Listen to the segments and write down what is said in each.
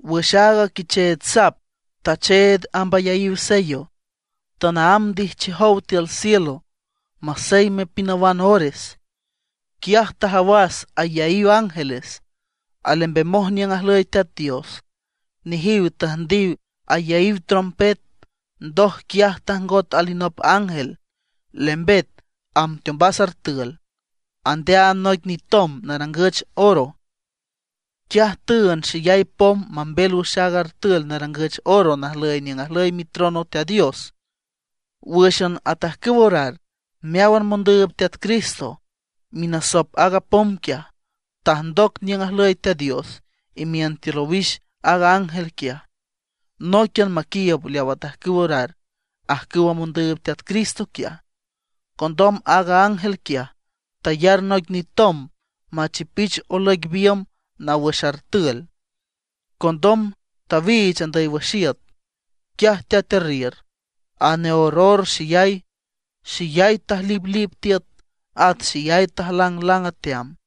Wüx aaga Quicheech Sap tacheed amb ayaíw sello, tanaámb ndijchiow tiül cielo maseyme pinawan ores. Quiaj tajawas ayaíw ángeles alembemoj niüng ajlüy Teat Dios. Nejiw tüjndiw ayaíw trompet. Ndoj quiaj tajngot alinop ángel, lembet amb teombas artül, andeaand noic nitomb narangüch oro. Quiaj tüünd xeyay pom mambel wüx aaga artül narangüch oro najlüy niüng ajlüy mitrono Teat Dios, wǘxan atajcüw orar meáwan mondüüb Teat Cristo. Minasop aaga pom quiaj, tajndoc niüng ajlüy Teat Dios imiün tiül owix aaga ángel quiaj, nóiquian maquiiüb leaw atajcüw orar ajcüwa mondüüb Teat Cristo quiaj. Condom aaga ángel quiaj, tayar noic nitomb machipich olüic biümb naw wüx artül. Condom tawiich andüy wüx iüt. Quiaj teatearriür, aneorror xeyay, xeyay tajliplip tiüt, at xeyay tajlanglang ateam.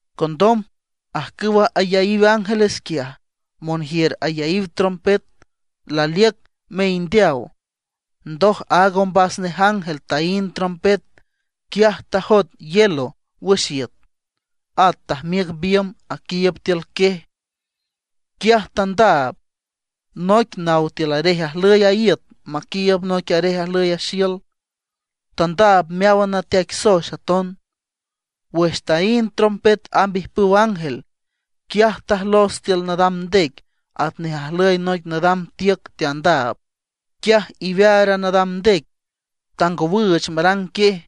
Condom ajcüwa ayaíw ángeles quiaj, monjiür ayaíw trompet, laliüc meindeaw. Ndoj aaga ombas nej ángel taínd trompet, quiaj tajoet hielo wüx iüt. At tajmiüc biümb aquiiüb tiül quiej. Quiaj tandaab noic naw tiül arej ajlüy a iüt maquiiüb noic arej ajlüy a xiül. Tandaab meáwan nateaic soex aton. Wüx taínd trompet amb ijpüw ángel, quiaj tajlos tiül nadam ndec atnej ajlüy noic nadam tiüc teandaab. Quiaj iwear a nadam ndec tangowüüch marang quiej.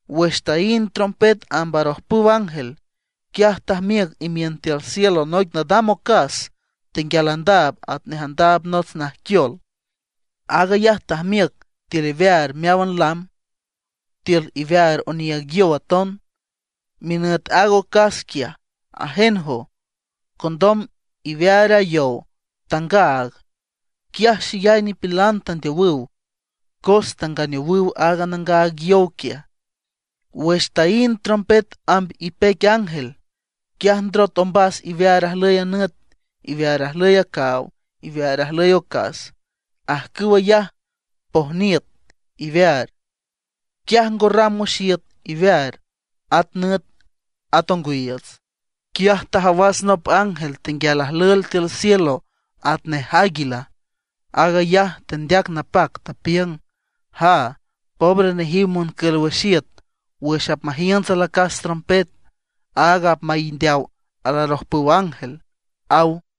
Wüx taínd trompet amb arojpüw ángel, quiaj tajmiüc imiün tiül cielo noic nadam ocas tenguial andaab atnej andaab nots najquiol. Aag ayaj tajmiüc tiül iwear meáwan lam, tiül iwear oniiüg yow aton. Minüt aaga ocas quiaj, Ajenjo. Condom iwear a yow tangaag. Quiaj xeyay nipilan tandeowüw, cos tanganeowüw aaga nangaag yow quiaj. Wüx taínd trompet amb ipeic ángel, quiaj ndrot ombas iwear ajlüy a nüt, iwear ajlüy a caaw, iwear ajlüy a ocas; ajcüw ayaj pojniüt iwear. Quiaj ngo ram wüx iüt iwear, at nüt, at ongwiiüts. Quiaj tajawas nop ángel tenguial ajlüel tiül cielo atnej águila. Aag ayaj tendeac napac, tapiüng: ―¡Jaa, pobre nejiw moncül wüx iüt wüx apmajiünts alacas trompet, áag apmaindeaw alarojpüw ángel! ―aw.